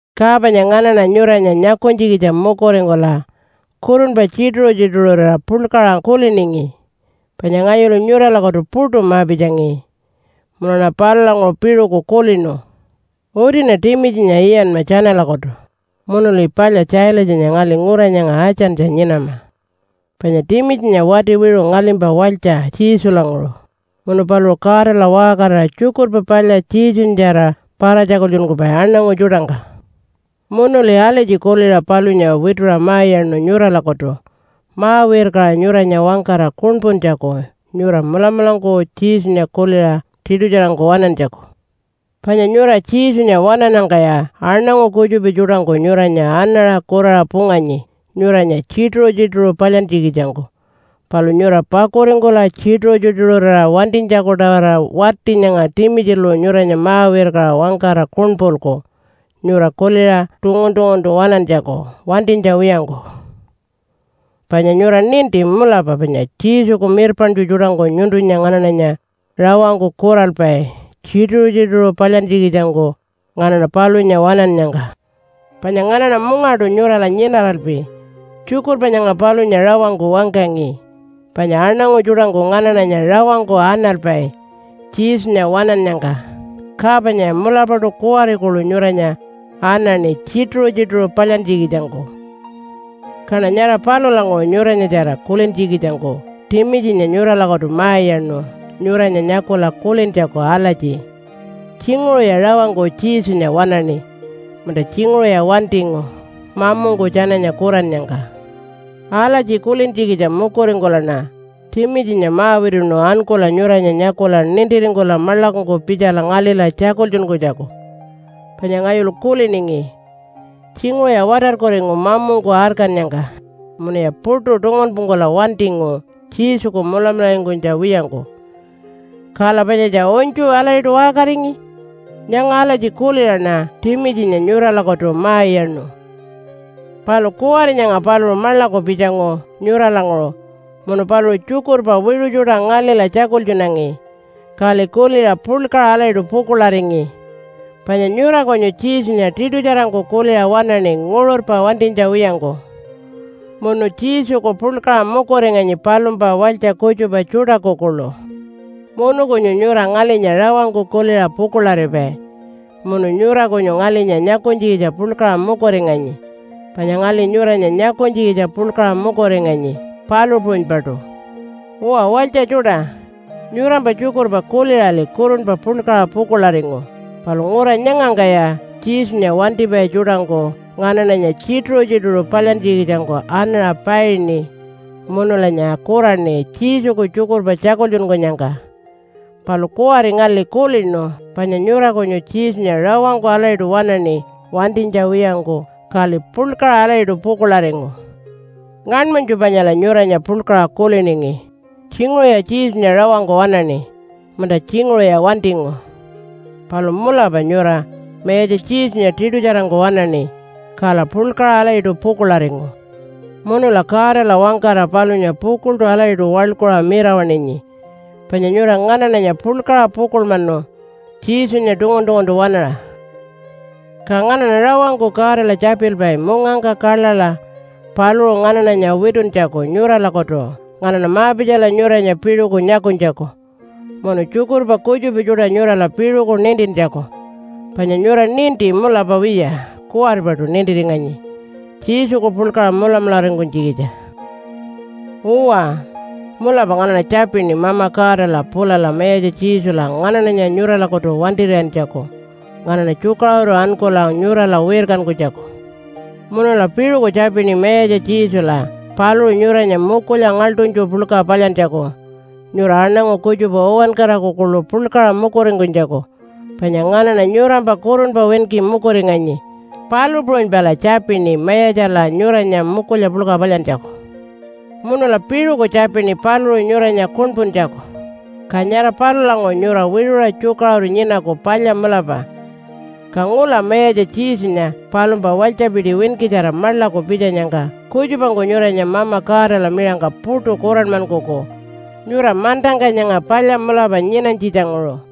Ka panya nganaṉa nyuranya nyakunytjikitja mukuringkula kurunpa tjituṟu-tjituṟurira puḻkaṟa kuliningi, panya ngayulu nyuralakutu puṯu ma-pitjangi. Munuṉa palulanguṟu piṟuku kulinu, “Utiṉa Timitjinya iyanma tjanalakutu, munuli palya Tjaalatjanya ngali ngura nyanga Atjantjala nyinama. Panya Timitjinya wati wiṟu ngalimpa walytja Jesulanguṟu, munu paluṟu Godala waṟkarira Tjukurpa Palya Jesunyatjara para-tjakultjunkupai aṉangu tjuṯangka.” Munuli alatji kuliṟa palunya wituṟa ma-iyaṉu nyuralakutu ma-wirkaṟa nyuranya wangkara kuṉpuntjaku nyura mulamulangku Jesunya kuliṟa tiṯutjarangku waṉantjaku. Panya nyura Jesunya waṉannyangkaya aṉangu kutjupa tjuṯangku nyuranya anaṟa kuraṟa punganyi nyuranya tjituṟu-tjituṟu palyantjikitjangku. Palu nyura pakuringkula tjituṟu-tjituṟurira wantinytjaku-tawara wati nyanga Timitjilu nyuranya ma-wirkaṟa wangkara kuṉpulku nyura kuliṟa tungun-tunguntu waṉantjaku wantinytja wiyangku. Panya nyura ninti, mulapa panya Jesuku mirpaṉtju tjuṯangku nyuntunya nganaṉanya rawangku kuralpai tjituṟu-tjituṟu palyantjikitjangku nganaṉa palunya waṉannyangka. Panya nganaṉa mungaṯu nyurala nyinaralpi tjukurpa nyanga palunya rawangku wangkangi panya aṉangu tjuṯangku nganaṉanya rawangku analpai Jesunya waṉannyangka. Ka panyaya mulapaṯu kuwari kuḻu nyuranya anaṉi tjituṟu-tjituṟu palyantjikitjangku. Kaṉa nyara palulanguṟu nyuranyatjara kulintjikitjangku Timitjinya nyuralakutu ma-iyaṉu nyuranya nyakula kulintjaku alatji, “Tjinguṟuya rawangku Jesunya waṉaṉi, munta tjinguṟuya wantingu mamungku tjananya kurannyangka?” Alatji kulintjikitja mukuringkulaṉa Timitjinya ma-wituṉu ankula nyuranya nyakula nintiringkula maḻakungku pitjala ngalila tjakultjunkunytjaku. Panya ngayulu kuliningi, “Tjinguṟuya watarkuringu mamungku arkannyangka, munuya puṯu tungunpungkula wantingu Jesuku mulamularingkunytja wiyangku. Kala panyatja unytju alatjiṯu waṟkaringi.” Nyanga alatji kuliṟaṉa Timitjinya nyuralakutu ma-iyaṉu. Palu kuwari nyanga paluṟu maḻaku pitjangu nyuralanguṟu munu paluṟu tjukurpa wiṟu tjuṯa ngalila tjakultjunangi, kali kuliṟa puḻkaṟa alatjiṯu pukuḻaringi. Panya nyura kunyu Jesunya tiṯutjarangku kuliṟa waṉaṉi nguṟurpa wantinytja wiyangku, munu Jesuku puḻkaṟa mukuringanyi palumpa walytja kutjupa tjuṯaku kuḻu. Munu kunyu nyura ngalinya rawangku kuliṟa pukuḻaripai munu nyura kunyu ngalinya nyakunytjikitja puḻkaṟa mukuringanyi, panya ngali nyuranya nyakunytjikitja puḻkaṟa mukuringanyi, palu puṟunypaṯu. Uwa walytja tjuṯa, nyurampa tjukurpa kuliṟali kurunpa puḻkaṟa pukuḻaringu. Palu ngura nyangangkaya Jesunya wantipai tjuṯangku nganaṉanya tjituṟu-tjituṟu palyantjikitjangku anaṟa paini munulanya kuraṉi Jesuku tjukurpa tjakultjunkunyangka. Palu kuwari ngali kulinu panya nyura kunyu Jesunya rawangku alatjiṯu waṉaṉi wantinytja wiyangku, kali puḻkaṟa alatjiṯu pukuḻaringu. Ngaṉmanytju panyala nyuranya puḻkaṟa kuliningi, “Tjinguṟuya Jesunya rawangku waṉaṉi, munta tjinguṟuya wantingu.” Palu mulapa nyura Mayatja Jesunya tiṯutjarangku waṉaṉi, kala puḻkaṟa alatjiṯu pukuḻaringu. Munula Godala wangkara palunya pukuḻṯu alatjiṯu waḻkuṟa mirawaṉinyi, panya nyura nganaṉanya puḻkaṟa pukuḻmanu Jesunya tungun-tunguntu waṉaṟa. Ka nganaṉa rawangku Godala tjapilpai mungangka kaḻaḻa paluṟu nganaṉanya wituntjaku nyuralakutu nganaṉa ma-pitjala nyuranya piṟuku nyakunytjaku, munu tjukurpa kutjupa tjuṯa nyurala piṟuku nintintjaku. Panya nyura ninti mulapa wiya kuwaripaṯu nintiringanyi Jesuku puḻkaṟa mulamularingkunytjikitja. Uwa, mulapa nganaṉa tjapini Mama Godala pulala Mayatja Jesula nganaṉanya nyuralakutu wantir'iyantjaku nganaṉa tjukaṟuru ankula nyurala wirkankunytjaku. Munula piṟuku tjapini Mayatja Jesula paluṟu nyuranya mukulya ngaḻṯunytju puḻka palyantjaku nyura aṉangu kutjupa uwankaraku kuḻu puḻkaṟa mukuringkunytjaku, panya nganaṉa nyurampa kurunpa winki mukuringanyi, palu puṟunypala tjapini Mayatjala nyuranya mukulya puḻka palyantjaku. Munula piṟuku tjapini paluṟu nyuranya kuṉpuntjaku. Ka nyara palulanguṟu nyura wiṟuṟa tjukaṟuru nyinaku palya mulapa. Ka ngula Mayatja Jesunya palumpa walytjapiti winkitjara maḻaku pitjanyangka kutjupangku nyuranya Mama Godala miṟangka puṯu kuranmankuku nyura mantangka nyanga palya mulapa nyinanytjitjanguṟu.